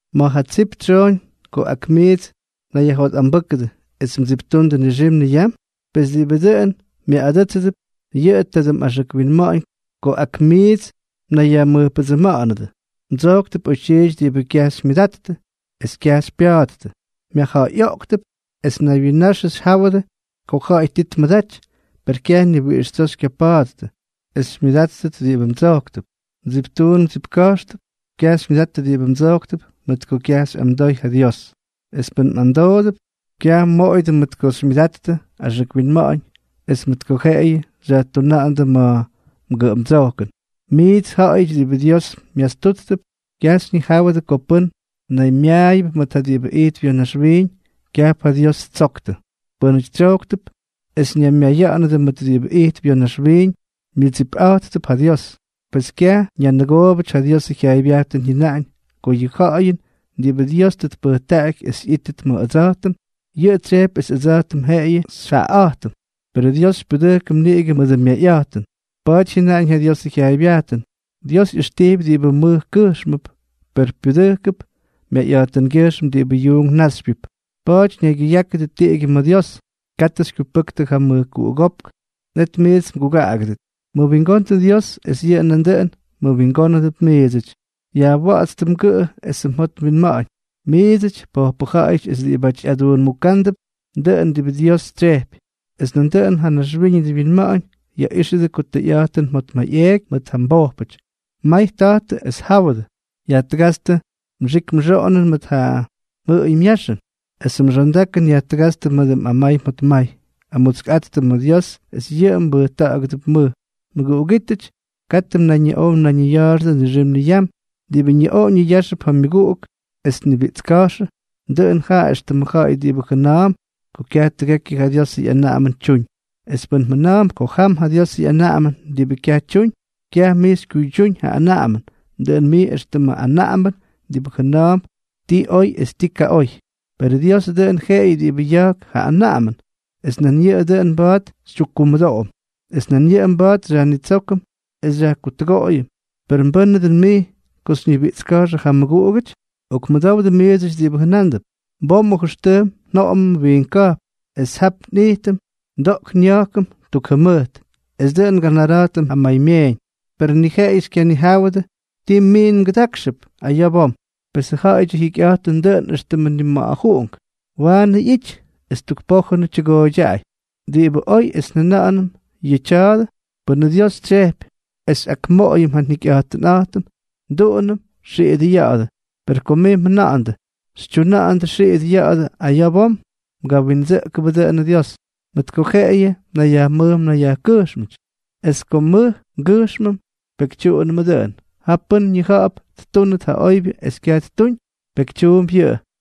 ¿Ma̱ ja tsip tsyooñ ko ak miits mnayyajjotꞌambʉ́kʉdʉ es mdsiptundʉ nixim niyam? Pes diꞌibʉ dʉꞌʉn myaꞌꞌadʉ́tsʉdʉp, yʉꞌʉ tadʉ mꞌaxʉk winma̱ꞌa̱ñ ko ak miits mnayyajmʉjpʉdsʉma̱ꞌa̱nʉdʉ. Mdsojktʉp oytyiity diꞌibʉ kyaj xymyʉdattʉ, es kyaj xypya̱a̱ttʉ; myajja̱ꞌa̱yꞌoꞌktʉp es naywyinnaxʉ xyjáwʉdʉ ko ja̱ꞌa̱y ti tmʉdaty, per kyaj ni wiꞌix tsoo xykyapa̱a̱ttʉ es xymyʉdáttʉt diꞌibʉ mdsojktʉp. Mdsiptuun mdsipka̱jxtʉp. Kyaj xymyʉdattʉ diꞌibʉ mdsojktʉp mʉt ko kyaj xyꞌamdoy ja Dios; es pʉn mꞌamdoodʉp, kyaj mmoꞌoyʉdʉ mʉt ko xymyʉdattʉ axʉk winma̱ꞌa̱ñ es mʉt ko jeꞌeyʉ xyajtuna̱ꞌa̱ndʉ ma̱ mgʉꞌʉmdsojkʉn. Miits, ja̱ꞌa̱yʉty diꞌibʉ Dios myastúttʉp, kyaj xyñijáwʉdʉ ko pʉ́n naymyaayʉp mʉt diꞌibʉ ijtp ya̱ naxwiiñ, kyajp ja Dios ttsoktʉ. Pʉ́nʉty tsyojktʉp es ñaymyaya̱ꞌa̱nʉdʉ mʉt diꞌibʉ ijtp ya̱ naxwiiñ, myʉdsipꞌa̱jttʉp ja Dios. Pes kyaj ñanʉgoobʉty ja Diosʉ jyaaybyajtʉn jyʉnaꞌañ ko yʉ ja̱ꞌa̱jʉn diꞌibʉ Dios tʉ tpʉjtaꞌaky es ꞌyítʉt ma̱ ʉdsa̱jtʉm, yʉꞌʉ tsyejpy es ʉdsa̱jtʉm jeꞌeyʉ xyjaꞌaꞌa̱jtʉm. Perʉ Dios xypyudʉjkʉm niꞌigʉ mʉdʉ myayꞌa̱jtʉn. Pa̱a̱ty jyʉnaꞌañ ja Diosʉ jyaaybyajtʉn: “Dios ꞌyʉxtijpy diꞌibʉ mʉj kʉjxmʉp, per pyudʉjkʉp myayꞌa̱jtʉngyʉjxm diꞌibʉ yuunk náxypyʉty.” Pa̱a̱ty naygyʉyákʉdʉ tiꞌigyʉ ma̱ Dios. Katʉ xykyupʉktʉ ja mʉjkuꞌugópk, net miits mgugaꞌagʉdʉt. Mʉwingondʉ Dios, es yʉꞌʉ nandʉꞌʉn mmʉwingónʉdʉp miidsʉty. Yajwa̱ꞌa̱tstʉ mgʉꞌʉ esʉ mjot mwinma̱ꞌa̱ñ, miidsʉty, pojpʉ ja̱ꞌa̱yʉty es diꞌibáty ꞌyaduunmukándʉp dʉꞌʉn diꞌibʉ Dios tsyejpy, es nandʉꞌʉn ja naxwíñʉdʉ winma̱ꞌa̱ñ. Yaꞌíxʉdʉ ko tʉyꞌa̱jtʉn mjotmayꞌeeky mʉt ja mbojpʉty. May ta̱jtʉ es jáwʉdʉ. Yajtʉgátstʉ mxik mxoꞌonʉn mʉt ja mjʉꞌʉy myaxʉn, esʉ mxondakʉn yajtʉgátstʉ mʉdʉ mꞌamay mjotmay. Amutskꞌattʉ ma̱ Dios, es yʉꞌʉ mbʉjta̱ꞌa̱gʉdʉp mʉj. Mʉguꞌugítʉty, katʉ mnayñiꞌow mnayñiya̱a̱xʉdʉ nixim niyam. Diꞌibʉ ñiꞌoꞌo ñiyáxʉp ja myʉguꞌuk es tnibiꞌtska̱jxʉ, dʉꞌʉn jaꞌa éxtʉmʉ ja̱ꞌa̱y diꞌibʉ jʉna̱a̱mp ko kyaj tʉgekyʉ ja Diosʉ ꞌyanaꞌamʉn tyuñ. Es pʉn mjʉna̱a̱mp ko tam ja Diosʉ ꞌyanaꞌamʉn diꞌibʉ kyaj tyuñ, kyaj mij xykyuydyúñ ja anaꞌamʉn, dʉꞌʉn mij éxtʉmʉ anaꞌambʉn diꞌibʉ jʉna̱a̱mp ti oy es ti kaꞌoy. Perʉ Diosʉ dʉꞌʉn jeꞌeyʉ diꞌibʉ ya̱jk ja anaꞌamʉn, es nan yʉꞌʉ dʉꞌʉn mba̱a̱t xytyukkumʉdoꞌom, es nan yʉꞌʉ mba̱a̱t xyajnitsókʉm es xyajkutʉgoꞌoyʉm; ¿per mbʉ́nʉ dʉn mij ko xyñibiꞌtska̱jxʉ ja mmʉguꞌugʉty? Okmʉdowdʉ miidsʉty diꞌibʉ jʉnándʉp: “Bom o jʉxtʉjm njoꞌomʉm wiink ka̱jpn, es jap nꞌijtʉm ndoꞌk nya̱jkʉm tuk jʉmʉjt, es dʉꞌʉn nganara̱jtʉm ja maymyeeñ.” ¡Per ni jeꞌeyʉ xykyanijáwʉdʉ ti miin mgʉdákxʉp aya̱ bom! Pes yʉ ja̱ꞌa̱yʉty ja jyikyꞌa̱jtʉn dʉꞌʉn éxtʉmʉ nima̱ꞌa̱juꞌunk, waanʉ ꞌyity es tuk pójʉnʉ tyʉgooydyaꞌay. Diꞌibʉ oy es njʉna̱ꞌa̱nʉm yʉꞌʉ tya̱a̱dʉ: “Pʉnʉ Dios tsyejpy es xyꞌakmoꞌoyʉm ja njikyꞌa̱jtʉnꞌa̱jtʉm, nduꞌunʉm xiꞌidʉ ya̱ꞌa̱dʉ.” Per ko mij mjʉna̱ꞌa̱ndʉ xytyuna̱ꞌa̱ndʉ xiꞌidʉ ya̱ꞌa̱dʉ aya̱ bom, mgawindsʉꞌkʉbʉ dʉꞌʉnʉ Dios, mʉt ko jeꞌeyʉ mnayyajmʉj mnayyajkʉjxmʉty. Es ko nmʉj ngʉjxmʉm, pekytyuꞌunʉmʉ dʉꞌʉn. Jaꞌa pʉ́n ñija̱ꞌa̱p ttúnʉt ja oybyʉ es kyaj ttuñ, pekytyuump yʉꞌʉ.